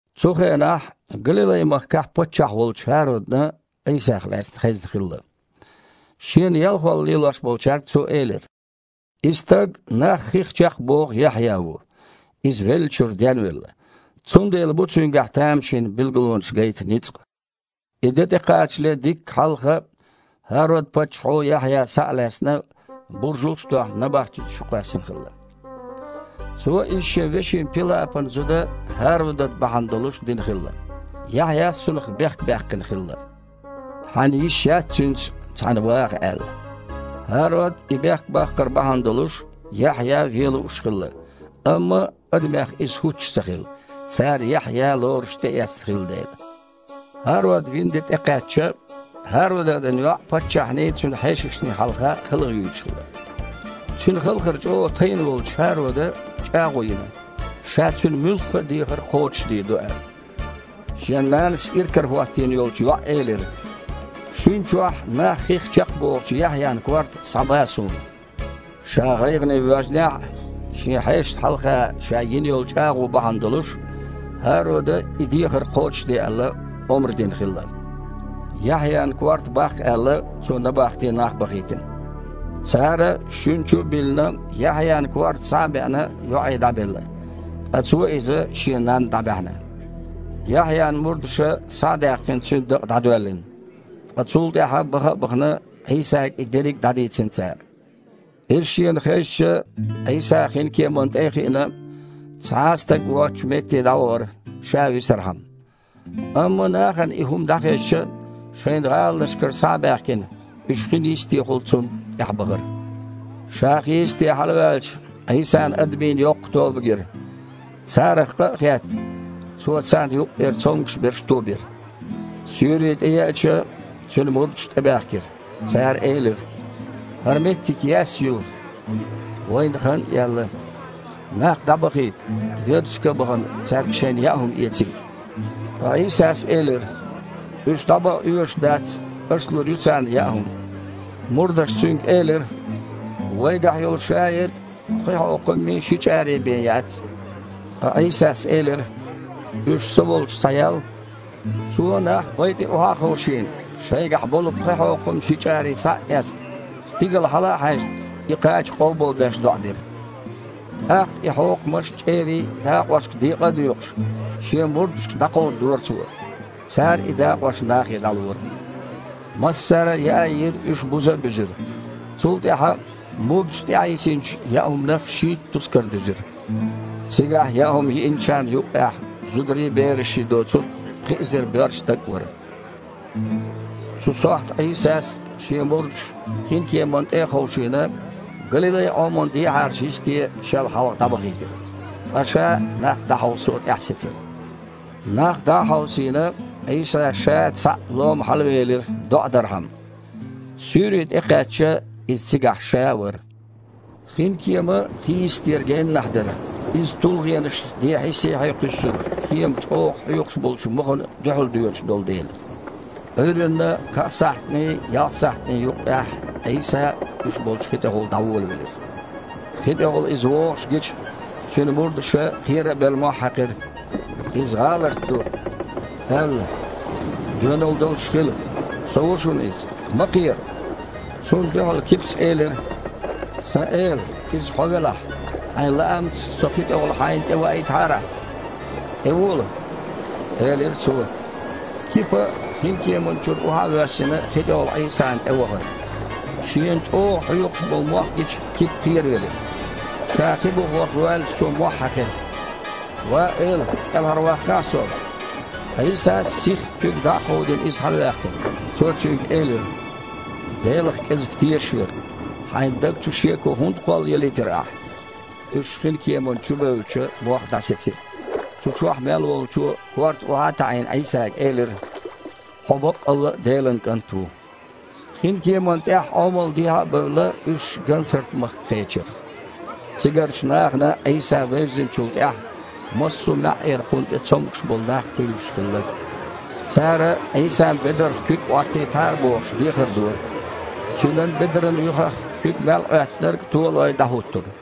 Цу хенахь Галилай-махкахь паччахь волчу ХІародана Іийсах лаьцна хезна хилла. Шена ялхолла лелош болчаьрга цо элира: «И стаг нах хих чекхбоху Яхьъя ву. Иза веллачуьра денвелла, цундела бу цуьнгахь тамашийна билгалонаш гайта ницкъ». И де тІекхачале дикка хьалха ХІарод-паччахьо Яхьъя, схьа а лаьцна, буржалш а тоьхна, набахти чу кхоьссина хилла. Цо иза шен вешин Пилапан зуда ХІародад бахьана долуш дина хилла. Яхьъяс цунах бехк баьккхина хилла: «Хьан йиш яц цуьнца цхьаьна ваха», – аьлла. ХІарод и бехк баккхар бахьана долуш Яхьъя вен лууш хилла, амма адамех иза хІуттуш ца хилла, цара Яхьъя лоруш тІеэцна хилла дела. ХІарод вина де тІекхаьчча, ХІародадан йоІ паччахьний, цуьнан хьешашний хьалха халхаюьйлуш хилла. Цуьнан халхар чІогІа тайна волчу ХІарода чІагІо йина, ша цуьнан муьлхха а дехар кхочушдийр ду аьлла. Шен нанас иракарахІоттийна йолчу йоІа элира: «Шуьна чохь нах хих чекхбохучу Яхьъян корта схьаба суна». Ша гІайгІане воьжнехь а, шен хьешашна хьалха ша йина йолу чІагІо бахьана долуш, ХІарода, и дехар кхочушде аьлла, омра дина хилла. Яхьъян корта баккха аьлла, цо набахте нах бахийтина. Цара, шуьна чу а биллина, Яхьъян корта, схьа а беана, йоІе дІабелла, ткъа цо иза шен нанна дІабаьхьна. Яхьъян мурдаша, схьа а даьккхина, цуьнан дакъа дІадоьллина, ткъа цул тІаьхьа, баха а бахана, Іийсага и дерриг дІадийцина цара. Иза шена хезча, Іийса, хинкеманна тІе а хиъна, цхьа а стаг воцучу метте дІавахара, ша висархьама. Амма нахана и хІума дІахезча, шайн гІаланашкара схьа а баьхкина, уьш хин йистехула Цунна тІаьхьабахара. Ша хийисте хьалаваьлча, Іийсана адамийн йоккха тоба гира. Царах къа а хетта, цо царна юккъера цомгуш берш тобира. Суьйре тІееъча, Цуьнан мурдаш тІебаьхкира. Цара элира: «ХІара меттиг яьсса ю. Вайна хан а яьлла. Нах дІабахийта, ярташка а бахана, цаьрга шайна яа хІума эцийта». Ткъа Іийсас элира: «Уьш дІабаха оьшуш дац. Аша лур ю царна яа хІума». Мурдаша Цуьнга элира: «Вайгахь йолу шаерг а пхи хьокхаммий, ши чІарий бен яц». Ткъа Іийсас элира: «Уьш Со волчу схьаял». Цо, нах бай тІе охьа а ховшийна, шайгахь болу пхи хьокхам, ши чІарий схьа а эцна, стигала хьала а хьаьжна, и кхача къобалбеш, доІа дира. ТІаккха и хьокхамаш а, чІерий а дакъошка декъа а доькъуш, Шен мурдашка дІакховдадора Цо. Цара и дакъош нахе дІалора. Массара а яа а йиира, уьш буза а буьзира. Цул тІаьхьа, мурдаша тІаьхьайисинчу яа хІуманах шийтта тускар дуьзира. Цигахь яа хІума йиъначарна юккъехь, зударий, берашший доцург, пхи эзар боьрша стаг а вара. Цу сохьта Іийсас Шен мурдаш, хинкеманна тІе а ховшийна, Галилай-Іоман дехьарачу йисте Шел хьалха дІабахийтира, ткъа Ша нах дІахьовсо тІаьхьасецира. Нах дІа а хьовсийна, Іийса Ша цхьаъ лома хьалавелира, доІа дархьама. Суьйре тІекхаьчча, Иза цигахь Ша вара. Хин кема хийистера геннахь дара. Иза тулгІенаша дехьий-сехьий кхуьссура, кема чІогІа хьоькхуш болчу мохана дуьхьал доьдуш долу дела. Іуьйранна кхаа сахьтаний, ялх сахьтаний юккъехь Іийса уьш болчу хи тІехула дІаволавелира. Хи тІехула Иза вогІуш гича, Цуьнан мурдаша, кхера а белла, мохь хьаькхира: «Иза гІаларт ду!» – аьлла. «Доьналла долуш хила! Со ву шуна иза! Ма кхера!» Цунна дуьхьал Кипас элира: «Сан Эла! Иза Хьо велахь, Хьайн лаамца со хи тІехула Хьайна тІе ваийтахьара Ахьа!» «ТІевола!» – элира Цо. Кипа, хинкеманна чуьра охьа а воьссина, хи тІехула Іийсана тІевахара. Шена чІогІа хьоькхуш болу мох гича, Кипа кхеравелира. Ша хи буха ваха воьлча, цо мохь хьаькхира: «Ва Эла! КІелхьарваккхахьа со!» Іийсас, сихха куьг дІа а кховдийна, иза хьалаваьккхира. Цо цуьнга элира: «Делах кІезиг тешаш верг! Хьайн даг чу шеко хІунда кхоллаялийтира ахьа?» Уьш хинкеманна чу бевлча, мох дІасецира. Цу чохь мел волчо а, корта охьа а таІийна, Іийсага элира: «Хьо баккъалла а Делан КІант ву!» Хин кеманна тІехь Іомал дехьа а бевлла, уьш Гансарт-махка кхечира. Цигарчу нахана Іийса вевзинчул тІаьхьа, массо а маьІІера Кхунна тІе цомгуш болу нах кхуьйлуш хилла. Цара, Іийсан бедарх куьг Іоттийтахьара бохуш, дехар дора. Цуьнан бедаран юьхах куьг мел Іоьттинарг, то а лой, дІахІуттура.